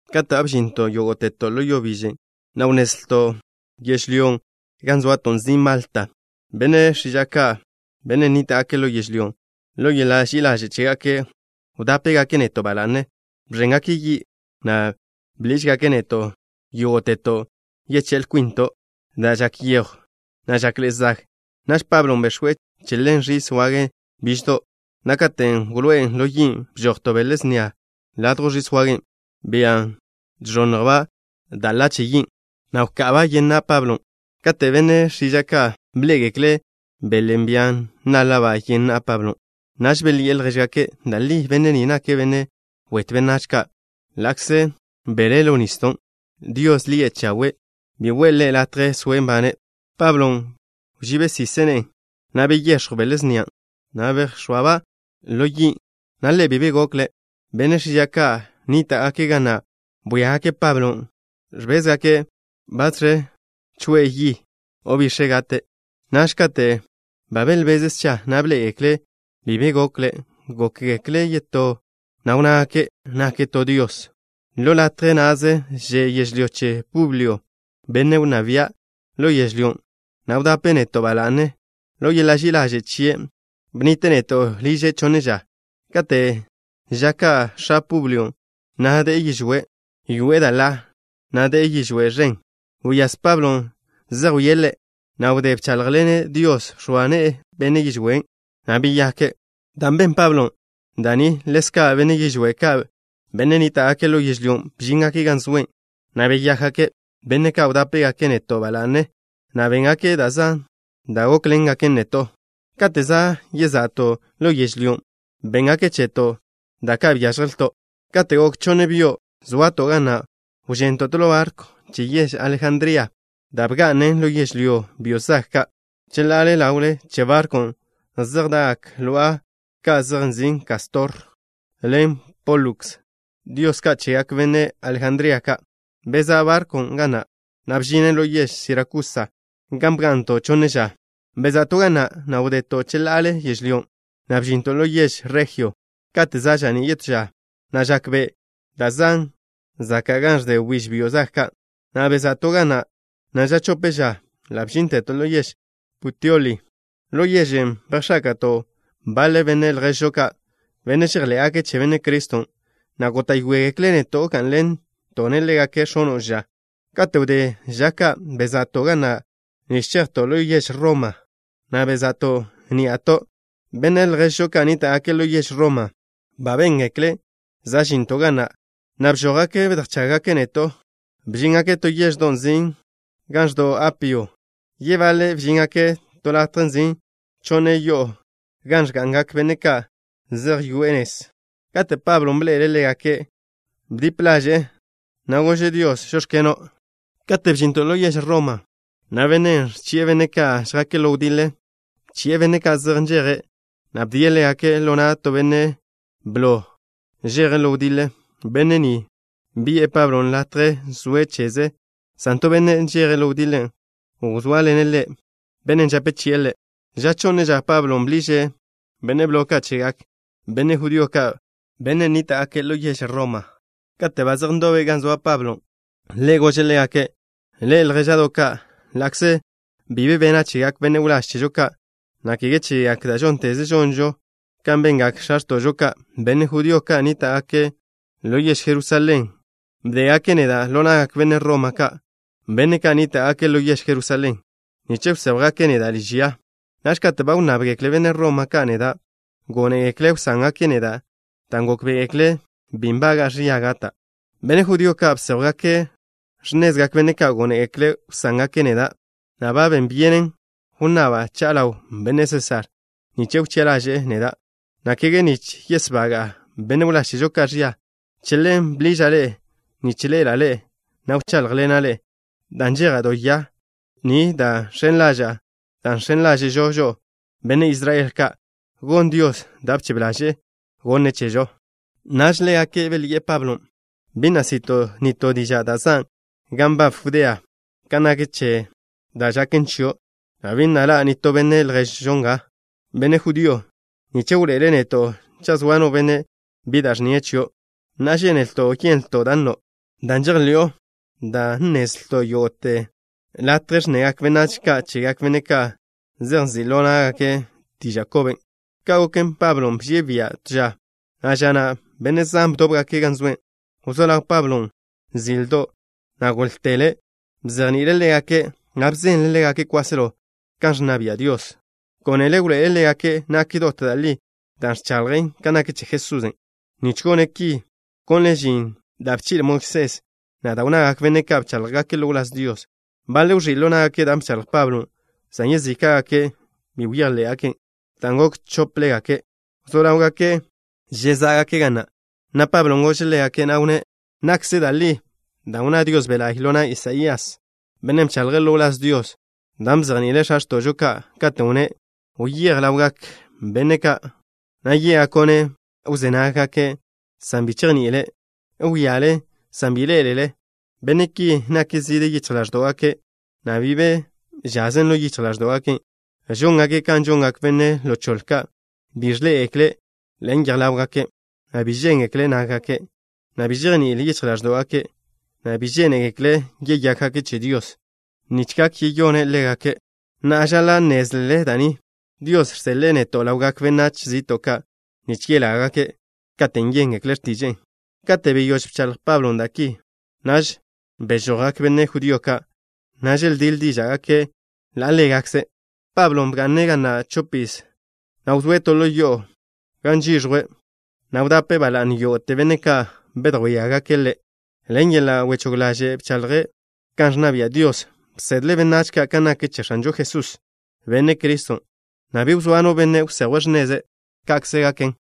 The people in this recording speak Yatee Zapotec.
Kate' ba bžinto' yógo'teto' ḻo yo biže, na' wnnezlto' yežlyón' gan zoato' nzin' Malta. Benne' x̱iža' ka', benne' nníta'gake' ḻo yežlyón', ḻo yeḻa' ži'i ḻaže' chégake' wdápegake' neto' ba la'ne. Bẕéngake' yi', na' bḻížgake' neto' yógo'teto' yeché'l kwinto', dan' žak yejw, na' žakḻe'e zag. Naž Pablo bex̱we' chelén ẕis wage biždo', na' katen' wloé'en ḻo yin', bžoj to bele snia ladjw ẕis wagen', bia žẕonnjlba' da' ḻa che yin', na' wka'aba' yen na' Pablon'. Kate' benne' x̱iža' ka' bḻé'egekle' belen', bia náḻa'ba' yen na' Pablon', naž belyi'e ljéžgake': —Da' li benne' ni nake' benne' wetw benách ka'. Ḻa'kze belé' ḻo nisdo', diosen' lie' Chawe' bi we'e ḻe' latje soe' nbane'. Pablon' bžíbesise' ne'e, na' beyex̱jw bele snia na'. Bejx̱óateba' ḻo yin', na' ḻe' bi be gokle'. Benne' x̱iža' ka' nníta'gake' ga na' bwíagake' Pablon'. Ẕbézgake' batẕe kwi'e yi, o bix̱e' gate'. Naž kate' ba belbeze' scha, na' bḻé'egekle' bi be gokle', gókgekle' yetó, na' wnnágake' nake' to dios. Ḻo latje na'ze že' yežlyó che Publio, benne' wnná bia' ḻo yežlyón', na' wdape' neto' ba la'ne. Ḻo yeḻa' ži'i ḻaže' chie' bnnite' neto' liže' chonne ža. Kate' ža ka' x̱a Publio na' de'e yižwé'. Yoe'e da' ḻa, na' de'e yižwé' žen. Wyáz Pablon', zejwíe' ḻe', na' wdé bcháḻjḻene' Dios, bx̱oa ne'e benne' yižwén', na' beyake'. Dan' ben Pablon' da' ni, ḻezka' benne' yižwé' ka', benne' nníta'gake' ḻo yežlyón', bžíngake' gan zoe', na' beyákgake'. Benne' ka' wdápegake' neto' ba la'ne, na' béngake' da' zan da' gókḻengaken neto'. Kate' za' yeza'to' ḻo yežlyón', bénngake' cheto' da' ka' byážjelto'. Kate' gok chonne byo' zoato' ga na', wžento' to ḻo barkw che yež Alejandría, da' bga'nen ḻo yežlyón' byo' zag ka'. Cheḻá'a ḻawle che barkwn' zej da'gak lo'a ka' zej nzin' Kástor ḻen Póluks, dios kwach ka' chegak benne' Alejandría ka'. Bezá' barkwn' ga na', na' bžinen ḻo yež Sirakusa, gan bga'nto' chonne ža. Beza'to' ga na', na' wdeto' cheḻa'ale yežlyón', na' bžinto' ḻo yež Rejio. Kate' za' ža'ní' yetó ža, na' žak be' da' zan' zaka' gan ẕde wbíž byo' zag ka', na' beza'to' ga na', na' ža chope ža ḻa' bžínteto' ḻo yež Puteoli. Ḻo yežen' bejx̱áka'to' baḻe benne' lježžo ka', benne' žejḻé'gake' che Benne' Criston', na' góta'yoegekle' neto' gá'nḻento' ḻégake' x̱ono' ža. Kate' wdé ža ka', beza'to' ga na' nich chejto' ḻo yež Roma, na' bezá' ní'ato'. Benne' lježžo ka' nníta'gake' ḻo yež Roma ba béngekle' za' žinto' ga na', na' bžójgake' bedjchággake' neto'. Bžíngake' to yeždo' nzin' Ga Ẕdo'w Apio. Yebaḻe' bžíngake' to latje nzin' Chonne Yo'o Gan Ẕga'ngak Benne' Ka' Zej Yoe'e Nez. Kate' Pablon' bḻe'ele' ḻégake', bdip ḻaže'e, na' gože' Dios: “Žóx̱keno'.” Kate' bžinto' ḻo yež Roma, na' bennen' ẕchi'e benne' ka' žjake' ḻo wdiḻe, bchi'e benne' ka' zej nžeje', na' bdie' ḻégake' ḻo na' to benne' blo žeje' ḻo wdiḻe. Benne' ni bi'e Pablo latje soe' cheze', san to benne' žeje' ḻo wdiḻe wzóaḻene' ḻe', bennen' žape chi'e ḻe'. Ža chonne ža, Pablon' bḻiže' benne' blo ka' chegak benne' judío ka', benne' nníta'gake' ḻo yež Roma. Kate' ba zej ndobe' gan zoa Pablon', ḻe' gože' ḻégake': —Ḻe'e, ljéža'do' ka', ḻa'kze bi be bena' chegak benne' wláž chežo ka', na' kege chegak da' žónteze žonžo kan bengak x̱a x̱to'žo ka', benne' judío ka' nníta'gake' ḻo yež Jerusalén bdégake' neda' ḻo na'gak benne' Roma ka', benne' ka' nníta'gake' ḻo yež Jerusalén, nich wséjwgake' neda' liž ya. Naž kate' ba wnnábgekle benne' Roma ka' neda', gónegekle' wsángake' neda', dan' gókbe'egekle' bi nbaga'a ẕia gata'. Benne' judío ka' bséjwgake' x̱nezgak benne' ka' gónegekle' wsángake' neda', na' ben byenen wnnaba' cha'a ḻaw benne' Sésar nich wchi'a ḻaže'e neda', na' kege nich yesbaga'a benne' wláž chežo ka' ẕia. Che ḻen bḻiža' ḻe'e nich ḻe'ela' ḻe'e, na' wcháḻjḻena' ḻe'e, dan' nžeja' do ya ni dan' žx̱en ḻaža'a da' žx̱en ḻáže'žo žo'o, benne' Israel ka', gon Dios da' bchebe ḻaže'e gonne' chežo. Naž ḻégake' belyi'e Pablon': —Bi na' si'to' nitó diža' da' zan' gan nbab Judea kan nak che da' žaken chio', na' bi na' ḻa' nitó benne' lježžo nga, benne' judío, nich wḻoe'ele' neto' cha' zoa no benne' bi da' ẕnnie' chio'. Na'a, žénelto' yenlto' da' nno', da' žejḻi'o, dan' nnezlto' yógo'te latje ẕnnegak benách ka' chegak benne' ka' zej nzi' ḻo ná'gake' diža' koben'. Ka' goken, Pablon' bžie' bia' to ža, na' ža na' benne' zan bdóbgake' gan zoe'. Wzó ḻaw Pablo zildo', na' góḻtele', bzejni'ile' ḻégake', na' bzenle' ḻégake' kwáselo kan ẕnna bia' Dios. Gónele' wḻoe'ele' ḻégake' nak dot da' li da' ẕchaḻje' kan nak che Jesusen'. Nich gone' ki bkonle' žin da' bchi'le Moisés, na' da' wnnagak benne' ka' bcháḻjgake' ḻo wláz Dios. Baḻe' wẕí' ḻo ná'gake' da' bchaḻj Pablon', san yezíka'gake' bi bejḻé'gaken'. Dan' gok chóplegake', wzó ḻáwgake' žezá'gake' ga na', na' Pablon' gože' ḻégake', na' wnné': —Nakkze da' li da' wnná Dios Be' La'y ḻo na' Isaías, bennen' bchaḻje' ḻo wláz Dios, dan' bzejni'ile' x̱a x̱to'žo ka', katen' wnné': Wyéj ḻawgak benne' ka', na' yé'gako'-ne': Wzé nagle, san bi chejní'ilele. Wíale, san bi ḻé'elele. Benne' ki nak zide yichj ḻáẕdo'gake' na' bi be žazen ḻo yichj ḻáẕdo'gake'. Žóngake' kan žongak benne' ḻo choḻe ka'. Bi ẕḻé'egekle' ḻen yej ḻáwgake' na' bi žéngekle nággake', na' bi žejní'il yichj ḻáẕdo'gake' na' bi žénegekle' yeyákgake' che Dios nich gak yeyóngaka'-ne'. Na'a, žaḻa' nnézlele da' ni. Dios žseḻe'e neto' ḻawgak benách zi'to' ka' nich yelágake', katen' yéngekle' x̱tiže'e. Kate' beyóž bchaḻj Pablon' da' ki, naž bežojgak benne' judío ka', na' želdíḻ díža'gake' ḻa' ḻégakze'. Pablon' bga'ne' ga na' chopiz, na' wzóe' to ḻo yo'o gan žiẕjwe', na' wdape' ba la'ne yógo'te benne' ka' bedjwíagake' ḻe'. Ḻen yeḻa' wechóg ḻaže' bchaḻje' kan ẕnna bia' Dios. Bsedle' benách ka' kan nak che X̱anžo Jesús, Benne' Criston', na' bi wzóa no benne' wsejwe' x̱neze'. Ka'kze naken.